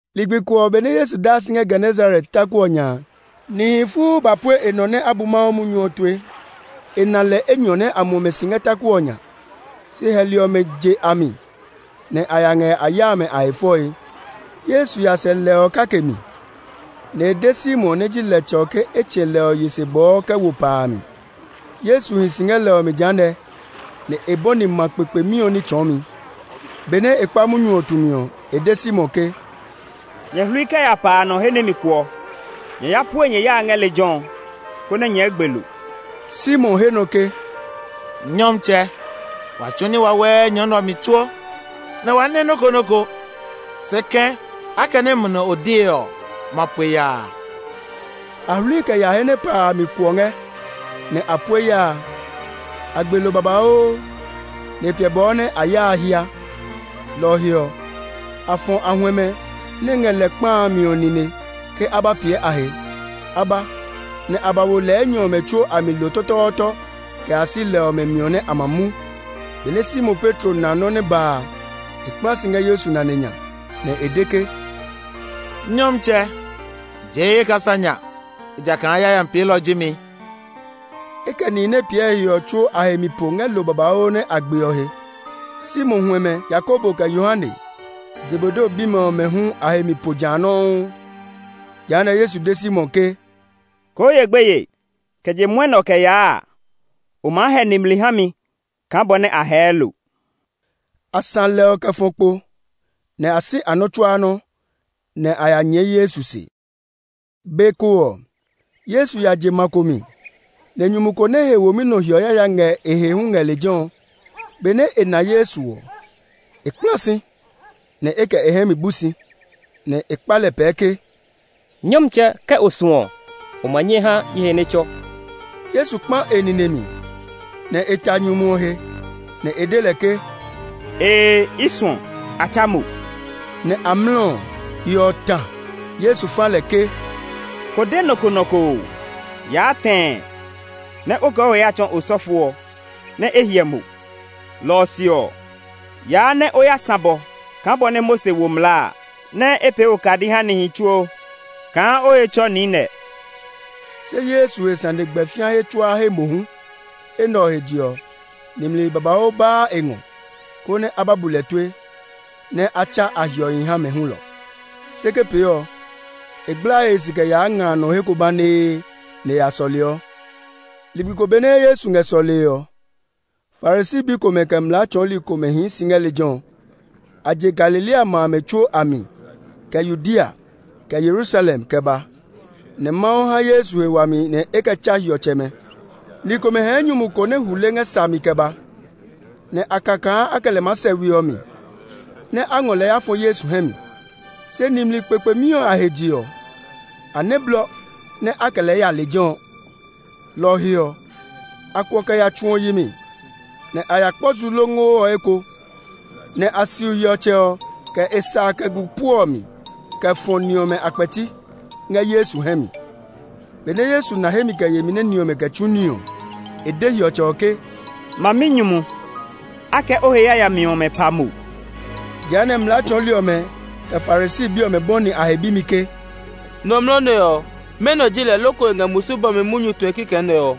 Ligbi ko ɔ, benɛ Yesu daa si ngɛ Genesaret taku ɔ nya a, nihi fuu ba pue e nɔ nɛ a bu Mawu munyu ɔ tue. E na lɛ enyɔ nɛ a muɔ mɛ si ngɛ taku ɔ nya; se hɛli ɔmɛ je a mi, nɛ a ya ngɛ a ya amɛ a he fɔe. Yesu ya sɛ lɛ ɔ kake mi, nɛ e de Simon nɛ ji lɛtsɛ ɔ ke e tsɛ̃ lɛ ɔ yi se bɔɔ kɛ wo pa a mi. Yesu hi si ngɛ lɛ ɔ mi jehanɛ, nɛ e bɔni ma kpekpemi ɔ ní tsɔɔmi. Benɛ e kpa munyu ɔ tumi ɔ, e de Simon ke, “Nyɛ hlui kɛ ya pa a nɔ he nɛ mi kuɔ. Nyɛ ya pue nyɛ ya a ngɛ lejɛ ɔ konɛ nyɛɛ gbe lo.” Simon he nɔ ke, “Nyɔmtsɛ, wa tsu ní wawɛɛ nyɔ nɛ ɔ mi tsuo, nɛ wa nɛ nɔ́ ko. Se kɛ̃, akɛnɛ mo lɛ o de ɔ, ma pue ya a.” A hlui kɛ ya he nɛ pa a mi kuɔ ngɛ, nɛ a pue ya a. A gbe lo babauu, nɛ e piɛ bɔɔ nɛ ya a hía. Lɔ ɔ he ɔ, a fɔ a huɛmɛ nɛ ngɛ lɛ kpa a mi ɔ nine ke a ba piɛ a he. A ba, nɛ a ba wo lɛ enyɔ ɔmɛ tsuo a mi lo tɔtɔɔtɔ kɛ ya si lɛ ɔmɛ miɔ nɛ a ma mu. Benɛ Simon Petro na nɔ́ nɛ ba a, e kpla si ngɛ Yesu nane nya, nɛ e de ke, “Nyɔmtsɛ! Jee ye kasa nya, ejakaa yayami peelɔ ji mi!” E kɛ nihi nɛ piɛ e he ɔ tsuo a he mi po ngɛ lo babauu ɔ nɛ a gbe ɔ he. Simon huɛmɛ, Yakobo, kɛ Yohane, Zebedeo bimɛ ɔmɛ hu a he mi po ja nɔuu. Jehanɛ Yesu de Simon ke, “Koo ye gbeye! Kɛ je mwɔnɛ ɔ kɛ yaa a, o maa hɛ nimli ha mi kaa bɔ nɛ a hɛɛ lo.” A sã lɛ ɔmɛ kɛ fɔ kpo, nɛ a si a nɔ́ tsuaa nɔ́, nɛ a ya nyɛɛ Yesu se. Be ko ɔ, Yesu ya je ma ko mi, nɛ nyumu ko nɛ he womi nɔ hiɔ yaya ngɛ e he hu ngɛ lejɛ ɔ. Benɛ e na Yesu ɔ, e kpla si, nɛ e kɛ e hɛ mi bu si, nɛ e kpa lɛ pɛɛ ke, “Nyɔmtsɛ, ke o suɔ ɔ, o ma nyɛ ha ye he nɛ tsɔ.” Yesu kpa e nine mi, nɛ e ta nyumu ɔ he, nɛ e de lɛ ke, “Ee, i suɔ! A tsa mo!” Nɛ amlɔ ɔ, hiɔ ɔ ta. Yesu fa lɛ ke, “Ko de nɔ ko nɔ ko oo! Yaa tɛɛ nɛ o kɛ o he ya tsɔɔ osɔfo ɔ, nɛ e hyɛ mo! Lɔ ɔ se ɔ, yaa, nɛ o ya sã bɔ kaa bɔ nɛ Mose wo mlaa a, nɛ e pee okadi ha nihi tsuo kaa o he tsɔ niinɛ.” Se Yesu he sane gbɛ fĩa he tsuaa he mohu. Enɛ ɔ he je ɔ, nimli babauu baa e ngɔ, konɛ a ba bu lɛ tue, nɛ a tsa a hiɔhi ha mɛ hulɔ. Se ke pee ɔ, e gblaa e he si kɛ yaa nga a nɔ he ko banee, nɛ e ya sɔleɔ. Ligbi ko benɛ Yesu ngɛ ní tsɔɔe ɔ, Farisi bi komɛ, kɛ mlaa tsɔɔli komɛ hii si ngɛ lejɛ ɔ. A je Galilea ma amɛ tsuo a mi, kɛ Yudea, kɛ Yerusalem kɛ ba. Nɛ Mawu ha Yesu he wami nɛ e kɛ tsa hiɔtsɛmɛ. Ni komɛ hɛɛ nyumu ko nɛ hule ngɛ sa mi kɛ ba, nɛ a ka kaa a kɛ lɛ maa sɛ we ɔ mi, nɛ́ a ngɔ lɛ ya fɔ Yesu hɛ mi. Se nimli kpekpemi ɔ a he je ɔ, a nɛ blɔ nɛ a kɛ lɛ nɛ ya lejɛ ɔ. Lɔ ɔ he ɔ, a kuɔ kɛ ya tsu ɔ yi mi, nɛ a ya kpɔ zu longo ɔ eko, nɛ a siu hiɔtsɛ ɔ, kɛ e sa a kɛ gu puɔ ɔ mi kɛ ya fɔ ni ɔmɛ a kpɛti, ngɛ Yesu hɛ mi. Benɛ Yesu na hemi kɛ yemi nɛ ni ɔmɛ kɛ tsu ní ɔ, e de hiɔtsɛ ɔ ke, “Maminyumu! A kɛ o he yayami ɔmɛ pa mo.” Jehanɛ, mlaa tsɔɔli ɔmɛ, kɛ Farisi bi ɔmɛ bɔni a he bimi ke, “Nɔmlɔ nɛ ɔ, mɛnɔ ji lɛ loko e ngɛ musu bɔmi munyu tue kikɛ nɛ ɔ?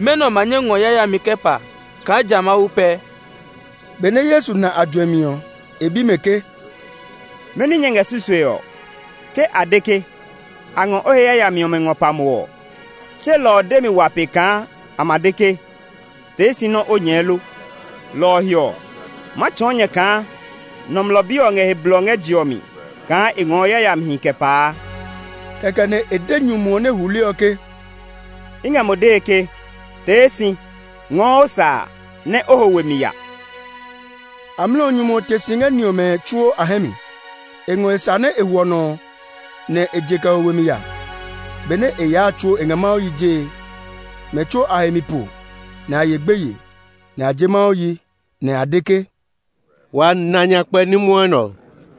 Mɛnɔ ma nyɛ ngɔ yayami kɛ pa, kaa ja Mawu pɛ?” Benɛ Yesu na a juɛmi ɔ, e bi mɛ ke, “Mɛni nyɛ ngɛ susue ɔ? Ke a de ke, ‘A ngɔ o he yayami ɔmɛ ngɔ pa mo’ ɔ, tse lɔ ɔ demi wa pe kaa a ma de ke, ‘Tee si nɛ o nyɛɛ lo?’ Lɔ ɔ he ɔ, ma tsɔɔ nyɛ kaa Nɔmlɔ Bi ɔ ngɛ he blɔ ngɛ je ɔ mi kaa e ngɔɔ yayamihi kɛ paa.” Kɛkɛ nɛ e de nyumu ɔ nɛ hule ɔ ke, “I ngɛ mo dee ke tee si! Ngɔɔ o sa a, nɛ o ho we mi ya!” Amlɔ ɔ, nyumu ɔ te si ngɛ ni ɔmɛ tsuo a hɛ mi; e ngɔ sa a nɛ e hwɔ nɔ ɔ, nɛ e je kɛ ho we mi ya. Benɛ e yaa a tsuo e ngɛ Mawu yi jee. Mɛ tsuo a he mi po, nɛ a ye gbeye, nɛ a je Mawu yi, nɛ a de ke, “Wa na nyakpɛ ní mwɔnɛ ɔ!”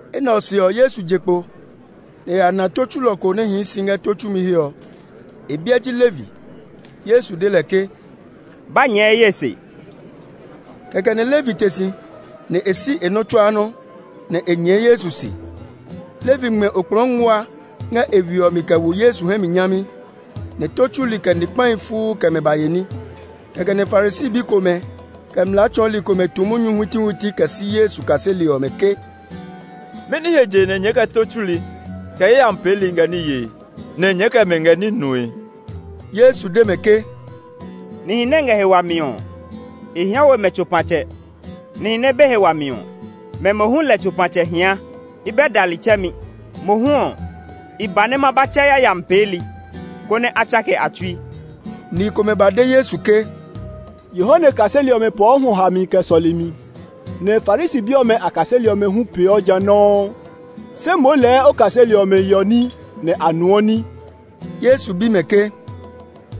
Enɛ ɔ se ɔ, Yesu je kpo, nɛ e ya na tó tsulɔ ko nɛ hii si ngɛ tó tsumi he ɔ; e biɛ ji Levi. Yesu de lɛ ke, “Ba nyɛɛ ye se!” Kɛkɛ nɛ Levi te si, nɛ e si e nɔ́ tsuaa nɔ́, nɛ e nyɛɛ Yesu se. Levi ngmɛ okplɔɔ nguaa ngɛ e we ɔ mi kɛ wo Yesu hɛ mi nyami, nɛ tó tsuli, kɛ ni kpahi fuu kɛ mɛ ba ye ní. Kɛkɛ nɛ Farisi bi komɛ, kɛ mlaa tsɔɔli komɛ tu munyu huitihuiti kɛ si Yesu kaseli ɔmɛ ke, “Mɛni he je nɛ nyɛɛ kɛ tó tsuli, kɛ yayami peeli ngɛ ní yee, nɛ nyɛɛ kɛ mɛ ngɛ ní nue ɔ?” Yesu de mɛ ke, “Nihi nɛ ngɛ he wami ɔ, e hia we mɛ tsopatsɛ; nihi nɛ be he wami ɔ, mɛ mohu lɛ tsopatsɛ hia. I bɛ dali tsɛmi; mohu ɔ, i ba nɛ ma ba tsɛ yayami peeli, konɛ a tsake a tsui.” Ni komɛ ba de Yesu ke, “Yohane kaseli ɔmɛ pɔɔ hwɔ hami kɛ sɔlemi, nɛ Farisi bi ɔmɛ a kaseli ɔmɛ hu peeɔ ja nɔuu; se moo lɛɛ o kaseli ɔmɛ yeɔ ní, nɛ a nuɔ ní.” Yesu bi mɛ ke,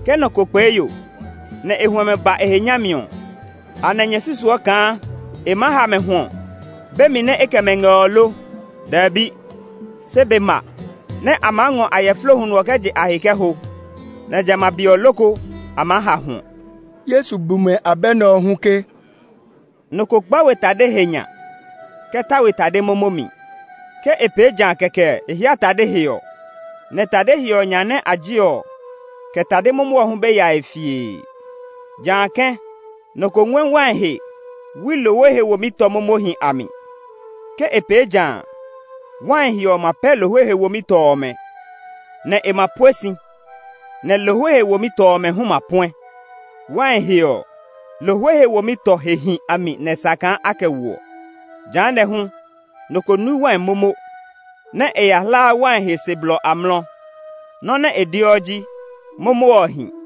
“Ke nɔ ko kpee yo, nɛ e huɛmɛ ba e he nyami ɔ, anɛ nyɛ susuɔ kaa e maa ha mɛ hwɔ be mi nɛ e kɛ mɛ ngɛ ɔ lo? Dɛbi! Se be ma, nɛ a maa ngɔ ayɛflo huno ɔ kɛ je a he kɛ ho; nɛ jamɛ a be ɔ loko a maa ha hwɔ!” Yesu bu mɛ abɛ nɛ ɔ hu ke, “Nɔ ko gba we tade he nya kɛ ta we tade momo mi. Ke e pee ja kɛkɛ e hia tade he ɔ, nɛ tade he ɔ nya nɛ a je ɔ, kɛ tade momo ɔ hu be yae fiee. Jã kɛ̃ nɔ ko ngɔɛ wai he wui lohwe he womi tɔ momohi a mi. Ke e pee ja a, wai he ɔ ma pɛ lohwe he womi tɔ ɔmɛ, nɛ e ma pue si, nɛ lohwe he womi tɔ ɔmɛ hu ma puɛ. Wai he ɔ, lohwe he womi tɔ hehi a mi nɛ e sa kaa a kɛ woɔ! Jehanɛ ɔ hu, nɔ ko nui wai momo, nɛ e ya hlaa wai he se blɔ amlɔ. Nɔ́ nɛ e deɔ ji, ‘Momo ɔ hi!’”